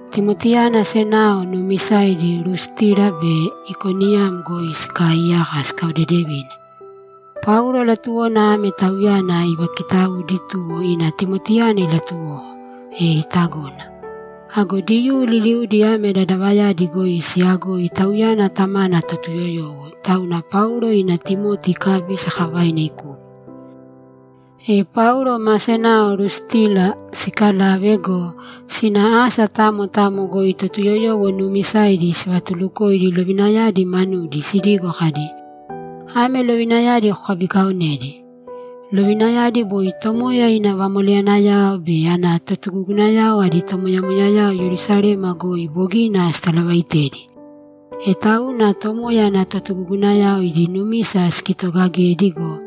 Timotiyana senao nuumisaidi Lustira be Ikoniyam goi sikaaiyaka sikaodedevine. Paulo latuwona ame tauyana ivakitaudi, tuwo ina Timotiyana ilatuwoko, e itagona. Ago Diyuu liliudi ame dadavayadi goi siyagoi tauyana tamana Totuyoyowo, tauna Paulo ina Timoti ikabi sakavaina ikupo. E Paulo ma senao Lustira sikalave go, sina asa tamo tamo goi Totuyoyowo nuumisaidi sivatulukoidi lovinayadi manudi sidigo kadi, ‘Ame lovinayadi kokabikaonēdi.’ Lovinayadi boi Tomoya ina vamoleyanayao be ana totugugunayao adi tomoyamoyayao Yerusalema goi bogina sitalavaitedi. E tauna Tomoya ana totugugunayao idi numisa sikitogagedi go,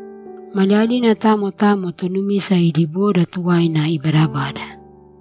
maliyalina tamo tamo tonumisa idi boda tuwaina ibaadabada.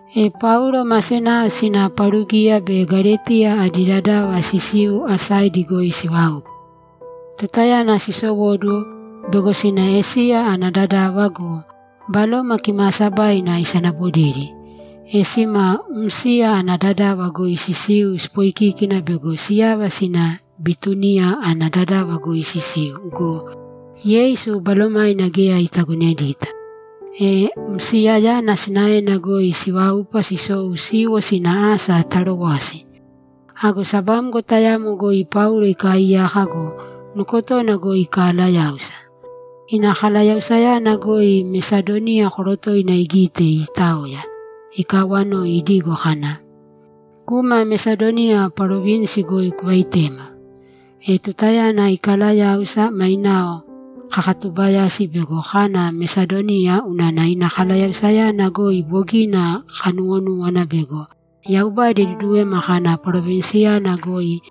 E Paulo ma senao sina Parugiya be Galetiya adi dadava sisiu asaidi goi siváupa. Tutayana sisowóduwo, bego sina Esiya ana dadava go, Baloma Kimaasabaina isanabodedi. E sima Msiya ana dadava goi sisiu sipoikíkina bego siyava sina Bituniya ana dadava goi sisiu go, Yeisu Balomaina geya itagonedita. E Msiyayana sinaena goi siváupa sisou siiwo sina asa Tarowasi. Ago sabamgo tayamo goi Paulo ikaaiyaka go, nukotona goi ikalayáusa. Ina kalayausayana goi Mesadoniya korotoina igite iitaoya, ikawanoi idigo kana, ‘Kūma Mesadoniya parovinsi goi kuvaitēma!’ E tutayana ikalayáusa, mainao kakatubayasi bego kana Mesadoniya unana ina kalayausayana goi bogina kanuwonúwana bego Yaubada iduduwema kana parovinsiyana goi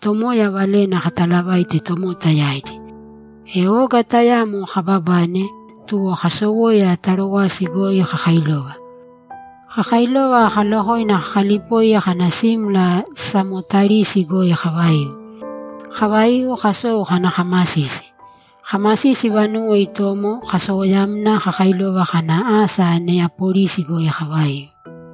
Tomoya valena katalavaite tomota yaidi. E oga tayamo kababane, tuwo kasowoya Tarowasi goi kakailova. Kakailova kalokoina kakalipoi kana simla Samotarisi goi kavaiu. Kavaiu, kasou kana kamasisi. Kamasisi vanuwo itomo, kasowoyamna kakailova kana asa Neyapolisi goi kavaiu.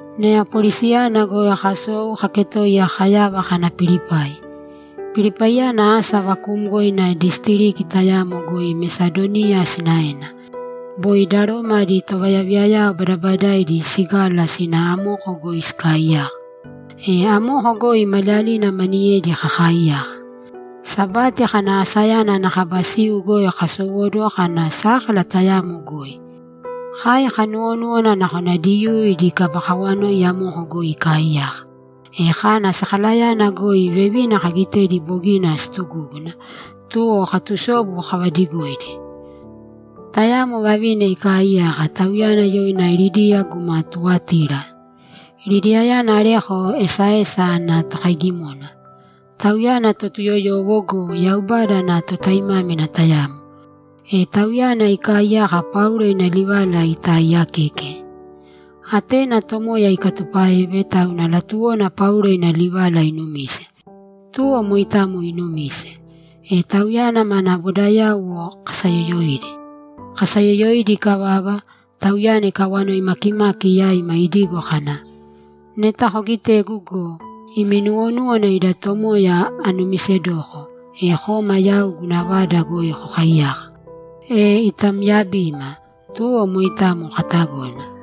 Neyapolisiyana goi kasou kaketoiya kayava kana Pilipai. Pilipaiyana asa vakuumgoina disitiriki tayamo goi Mesadoniya sinaena. Boi da Roma adi tovayaviyayao badabadaidi sigala sina amoko goi sikaaiyaka. E amoko goi maliyalina maniyedi kakaaiyaka. Sabati kana asayana ana kaba siu goi kasowóduwo kana sákala tayamo goi. Kai kanuwonúwana nakona Diyuu idi kaba kawanoi amoko goi ikaaiyaka. E kana sakalayana goi vevina kagitedi bogina siitugúguna, tuwo katusobu kavadigoidi. Tayamo vavina ikaaiyaka; tauyana yoina Lidiya guma Tuwatira. Lidiyayana areko esaesa ana tokaigimona. Tauyana Totuyoyowo go, Yaubada ana totaimámina tayamo. E tauyana ikaaiyaka Paulo ina livala itaaiyakeke. Atena Tomoya ikatupáeve, tauna latuwona Paulo ina livala inumise. Tuwo moitamo inumise. E tauyana mana bodayauwo kasayoyoidi. Kasayoyoidi ikavava, tauyana ikawanoi makimaki yaima idigo kana, ‘Neta kogitegu go, imi nuwonúwana ida Tomoya anumisedoko, e kōma yau guna vada goi kokaiyāka.’ E itamyabima, tuwo moitamo katagona.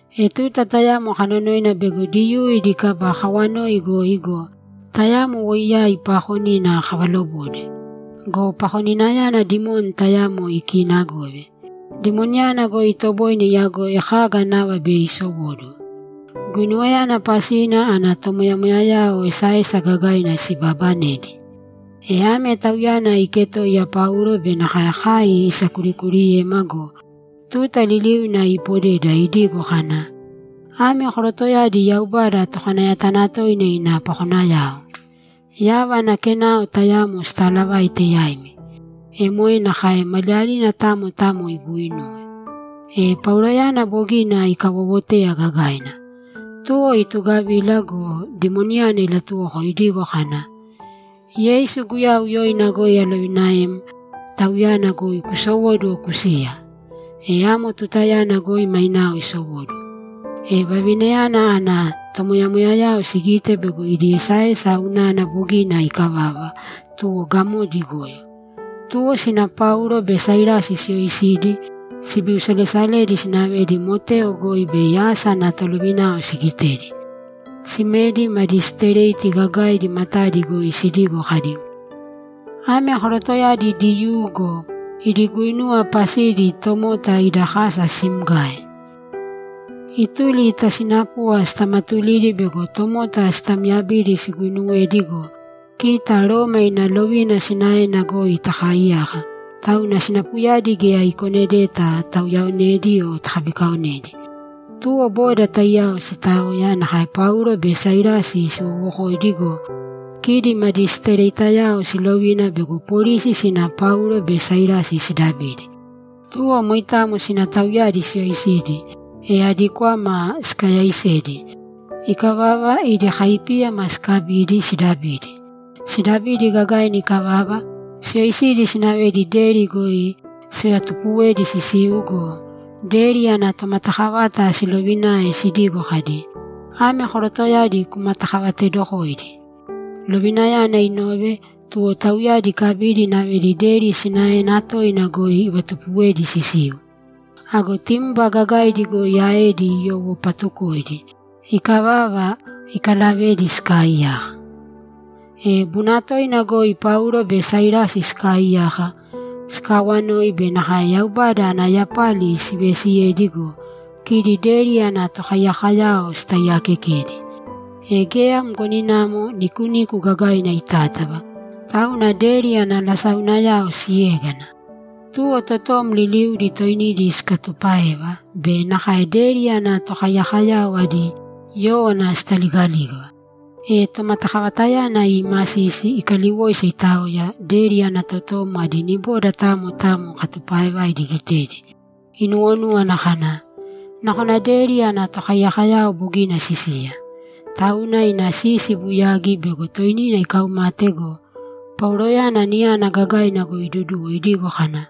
E tuta tayamo kanonoina bego Diyuu idi kaba kawanoi goi go, tayamo woiyai paakonina kavalobode. Go pakoninayana dimoni tayamo ikiinagove. Dimoniyana goi itoboine iyagoi kaga nava bei isowóduwo. Guinuwayana pasina ana tomoyamoyayao esaesa gagaina sibabanedi. E ame tauyana iketoiya Paulo be nakae kai isakurikuuriyema go, tuta liliuna ipodeda idigo kana, ‘Ame korotoyadi yaubada tokanayatanatoina ina pakonayao. Yava ana kenao tayamo sitaalavaite yaimi.’ E moe nakae maliyalina tamo tamo iguuinuwe. E Pauloyana bogina ikawowoteya gagaina. Tuwo itugavila go, dimoniyana ilatuwoko idigo kana, ‘Yeisu Guyau yoina goi alovinaem, tauyana goi kusowōduwo kusīya!’ E amo tutayana goi mainao isowóduwo. E vavinayana ana tomoyamoyayao sigite bego idi esaesa unana bogina ikavava, tuwo gamodi igoyo. Tuwo sina Paulo be Sailasi siyoisidi, sibiusalesaledi sinavedi moteo goi bei asa ana tolovinao sigitedi. Simedi madisitireti gagaidi matadi goi sidigo kadi, ‘Ame korotoyadi Diyuu go, idi guinuwa pasidi tomota ida kasa simgae. Ituli ta sinapuva sitamatulidi bego tomota sitamyabidi siguinuwedi go, kita Roma ina lovina sinaena goi takaaiyaka, tauna sinapuyadi geya ikonedeta tauyaonedi o takabikaonedi.’ Tuwo boda taiyao sitaoya, nakae Paulo be Sailasi siwowokoidi go, kidi madisitiretiyao silovina bego polisi sina Paulo be Sailasi sidabidi. Tuwo moitamo sina tauyadi siyoisidi, e adi kwama sikayaisedi. Ikavava, idi kaipíyama sikabidi, sidabidi. Sidabidi gagaina ikavava, siyoisidi sinavedi deri goi sivatupuwedi sisiu go, deri ana tomatakavata silovinae sidigo kadi, ‘Ame korotoyadi kumatakavatedokōidi.’ Lovinayana inove, tuwo tauyadi ikabidi inavedi deri sinaena toina goi ivatupuwedi sisiu. Ago timba gagaidi goi aedi iyowopatukoidi. Ikavava, ikalavedi sikaaiyaka. E bunatoina goi Paulo be Sailasi sikaaiyaka, sikaawanoi be nakae Yaubada ana yapali siveesiyedi go, kidi deri ana tokaiyakoyao sitaiyaakekedi. E geya mgoninamo nikuniku gagaina itátava, tauna deri ana lasaunayao siégana. Tuwo totom liliudi toinidi sikatupáeva be nakae deri ana tokaiyakoyao adi yówana sitaligalígava. E tomatakavatayana iimasisi, ikaliwoisa, itaoya, deri ana totom adi niboda tamo tamo katupaaevaidi igitedi, inuwonúwana kana, ‘Nakona deri ana tokaiyakoyao bogina sisiya.’ Tauna ina sisi ibuyagi bego toinina ikaumate go, Pauloyana niyana gagaina goi iduduwo idigo kana,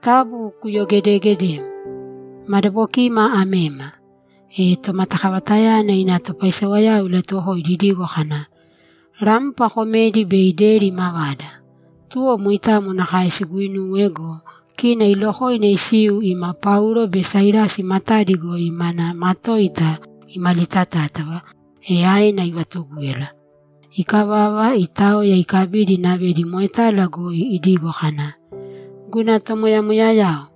‘Taabu kuyogedegedēm! Madabokima amema.’ E tomatakavatayana ina topaisewayao ilatuwokoidi idigo kana, ‘Rampa komēdi bei deri imavada!’ Tuwo moitamo nakae siguinuwe go, kina ilokoina isiu ima Paulo be Sailasi matadi goi mana matoita imalitatátava, e aena ivatugúyala. Ikavava, itaoya, ikabidi inavedi moetala goi idigo kana, ‘Guna tomoyamoyayao,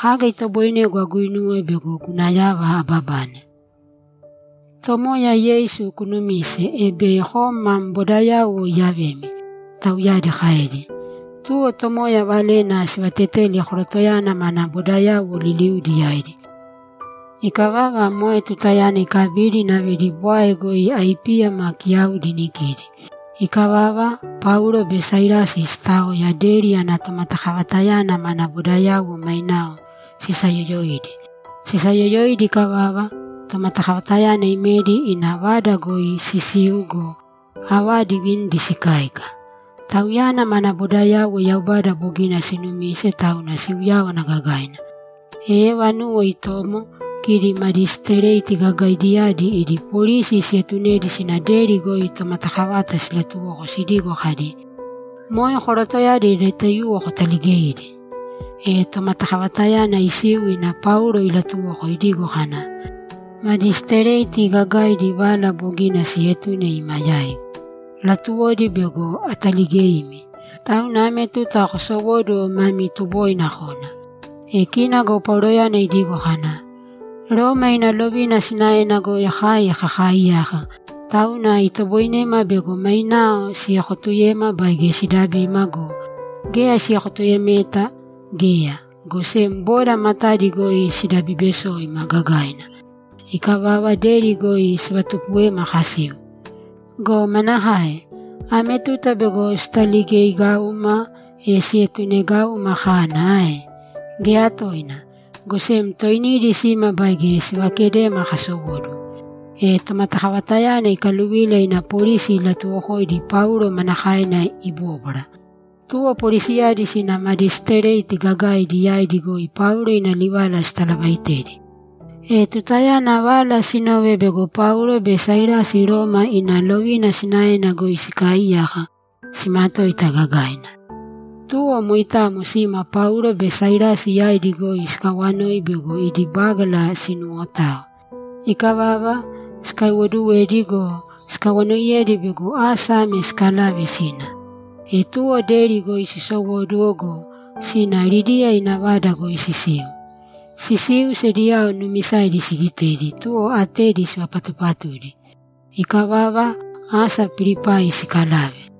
kaga itoboinegu aguinuwe bego guna yava ababane?’ ‘Tomoya Yeisu kunumīse, e bei kom mam bodayauwo iyavemi’, tauyadi kaedi. Tuwo Tomoya valena sivateteli korotoyana mana bodayauwo liliudi yaidi. Ikavava, moe tutayana ikabidi inavedi bwae goi aipíyama kiyaudi inikidi. Ikavava, Paulo be Sailasi sitaoya, deri ana tomatakavatayana mana bodayauwo mainao sisayoyoidi. Sisayoyoidi ikavava, tomatakavatayana imedi ina vada goi sisiu go, avadi ivinidi sikáika. Tauyana mana bodayauwo Yaubada bogina sinumise, tauna siuyáwana gagaina. E vanuwo itomo, kidi madisitireti gagaidiyadi idi polisi sietunedi sina deri goi tomatakavata silatuwoko sidigo kadi, ‘Moe korotoyadi adi taiyuwo kutaligēidi.’ E tomatakavatayana isiu ina Paulo ilatuwoko idigo kana, ‘Madisitireti gagaidi vala bogina sietune ima yaigu; latuwodi bego ataligeimi. Tauna ame tuta kosowōduwo mami tuboina kōna.’ E kina go Pauloyana idigo kana, ‘Roma ina lovina sinaena goi kai kakaaiyaka, tauna itoboinema bego mainao siekotuyema baige sidabima go, geya siekotuyemeta geya, go sem boda matadi goi sidabibesoima gagaina. Ikavava, deri goi sivatupuwema kasiu. Go manakae? Ame tuta bego sitaligeigauma, e sietunegauma kana ae? Geya toina! Go sem toinidi sīma baige sivakedēma kasowóduwo.’ E tomatakavatayana ikaluvila ina polisi ilatuwokoidi Paulo manakaena ibóbwara. Tuwo polisiyadi sina madisitireti gagaidi yaidi goi Paulo ina livala sitalavaitedi. E tutayana vala sinove bego Paulo be Sailasi Roma ina lovina sinaena goi sikaaiyaka, simatoita gagaina. Tuwo moitamo sima Paulo be Sailasi yaidi goi sikawanoi bego idi bágala sinuwotao. Ikavava, sikaiwoduwedi go, sikawanoiyedi bego asa ame sikalave sina. E tuwo deri goi sisowóduwo go, sina Lidiya ina vada goi sisiu. Sisiu, sediyao nuumisaidi sigitedi, tuwo atedi sivapatupatudi. Ikavava, asa Pilipai sikalave.